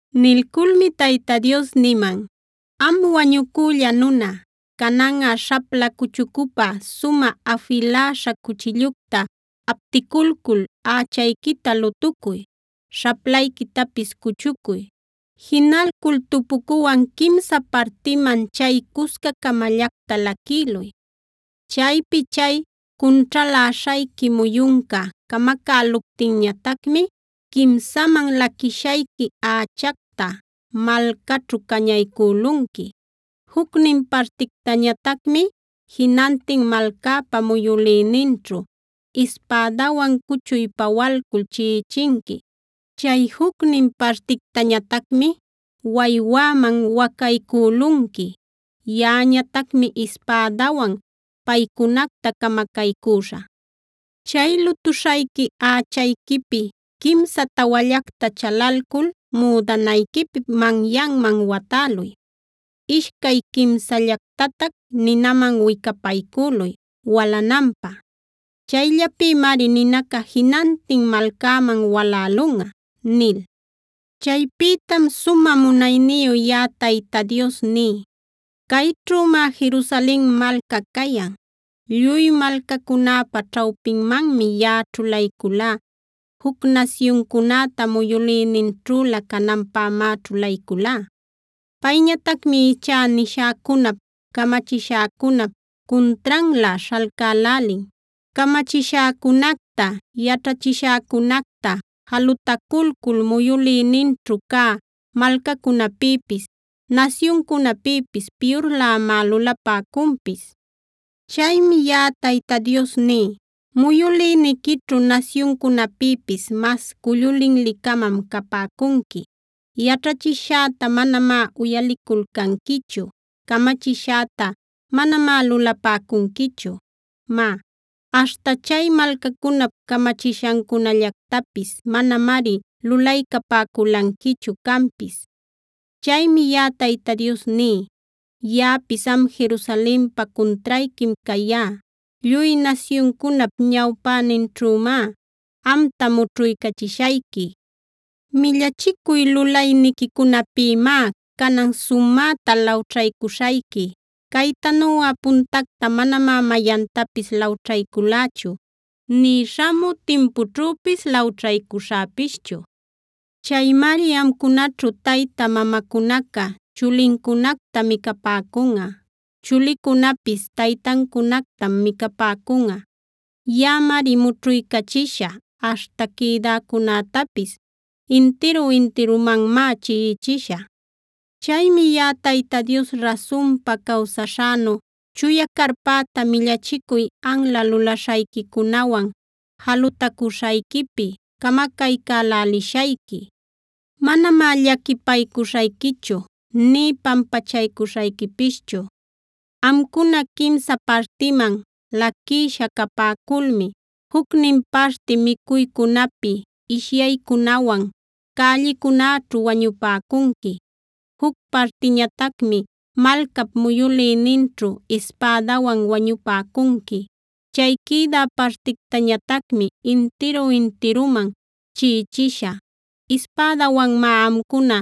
Nilculmi Tayta Dios niman: “Am wañucülla nuna, cananꞌa śhapla cuchucupä sumä afiläśha cuchillucta apticulcul ächayquita lutucuy; śhaplayquitapis cuchucuy. Jinalcul tupucuwan quimsa partiman chay cusca-camallacta laquïluy. Chaypi chay cunćhaläśhayqui muyunca camacäluptinñatacmi quimsaman laquishayqui ächacta malcaćhu cañaycülunqui; jucnin partictañatacmi jinantin malcäpa muyülïninćhu ispädawan cuchuy pawalcul chiꞌichinqui. Chay jucnin partictañatacmi waywäman wacaycülunqui. Yaꞌañatacmari ispädäwan paycunacta camacaycüśhä. Chay lutuśhayqui ächayquipi quimsa tawallacta chalalcul müdanayquip manyanman watäluy. Ishcay quimsallactatac ninaman wicapaycüluy walananpä. Chayllapïmari ninaca jinantin malcäman walälunꞌa” nil. Chaypïtam sumä munayniyu yaꞌa Tayta Dios ní: “Cayćhümá Jerusalen malca cayan. Lluy malcacunäpa ćhawpinmanmi yaꞌa ćhulayculá; juc nasyuncunäta muyülïninćhülä cananpämá ćhulayculá. Payñatacmi ichá nishäcunap, camachishäcunap cuntranlä śhalcälälin. Camachishäcunacta, yaćhachishäcunacta jalutaculcul muyülïninćhu cä malcacunäpïpis, nasyuncunäpïpis piyurlämá lulapäcunpis. “Chaymi yaꞌa Tayta Dios ní: Muyülïniquićhu nasyuncunäpïpis mas cullu linli-camam capäcunqui. Yaćhachishäta manamá uyaliculcanquichu; camachishäta manamá lulapäcunquichu. Má, aśhta chay malcacunap camachishancunallactapis manamari lulaycapäculanquichu canpis. Chaymi yaꞌa Tayta Dios ní: Yaꞌapis am Jerusalenpa cuntrayquim cayá. Lluy nasyuncunap ñawpäninćhümá amta mućhuycachishayqui. Millachicuy lulayniquicunapïmá canan sumäta lawćhaycuśhayqui; caytanuꞌa puntacta manamá mayantapis lawćhayculächu nï śhamü timpućhüpis lawćhaycuśhäpischu. Chaymari amcunaćhu tayta mamacunaca chulincunacta micapäcunꞌa;a chulicunäpis taytancunactam micapäcunꞌa. Yaꞌamari mućhuycachishä, aśhta quïdäcunätapis intiru-intirumanmá chiꞌichishä. “Chaymi yaꞌa Tayta Dios rasunpa cawsaśhänu, chuya carpäta millachicuy anla lulaśhayquicunawan jalutacuśhayquipi camacaycälälishayqui; manamá llaquipaycuśhayquichu nï pampachaycuśhayquipischu. Amcuna quimsa partiman laquïsha capäculmi jucnin parti micuycunapi, ishyaycunawan cällicunäćhu wañupäcunqui. Juc partiñatacmi malcap muyülïninćhu ispädawan wañupäcunqui. Chay quïdä partictañatacmi intiru-intiruman chiꞌichishä. Ispädäwanmá amcuna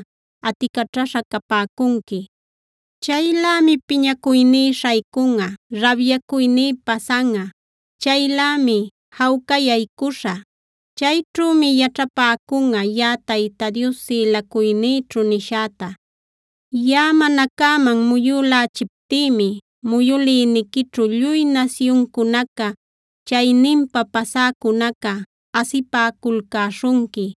aticaćhaśha capäcunqui. “Chaylämi piñacuyní śhaycunꞌa, rabyacuyní pasanꞌa; chaylämi jawcayaycuśhä. Chayćhümi yaćhapäcunꞌa yaꞌa Tayta Dios sïlacuynïćhu nishäta. Yaꞌa mana cäman muyülächiptïmi muyülïniquićhu lluy nasyuncunaca, chayninpa pasäcunaca asipäculcäśhunqui.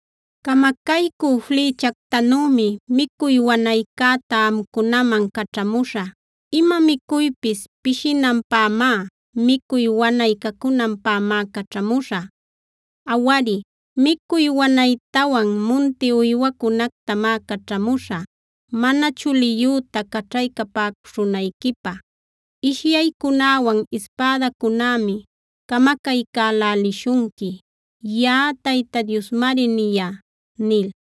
“Camacaycü flïchactanümi micuy wanaycäta amcunaman caćhamuśhä. Ima micuypis pishinanpämá, micuy wanay cacunanpämá caćhamuśhä. Awari, micuy wanaytawan munti uywacunactamá caćhamuśhä mana chuliyüta caćhaycapäcuśhunayquipä. Ishyaycunäwan ispädacunämi camacaycälälishunqui.b Yaꞌa Tayta Diosmari niyá” nil.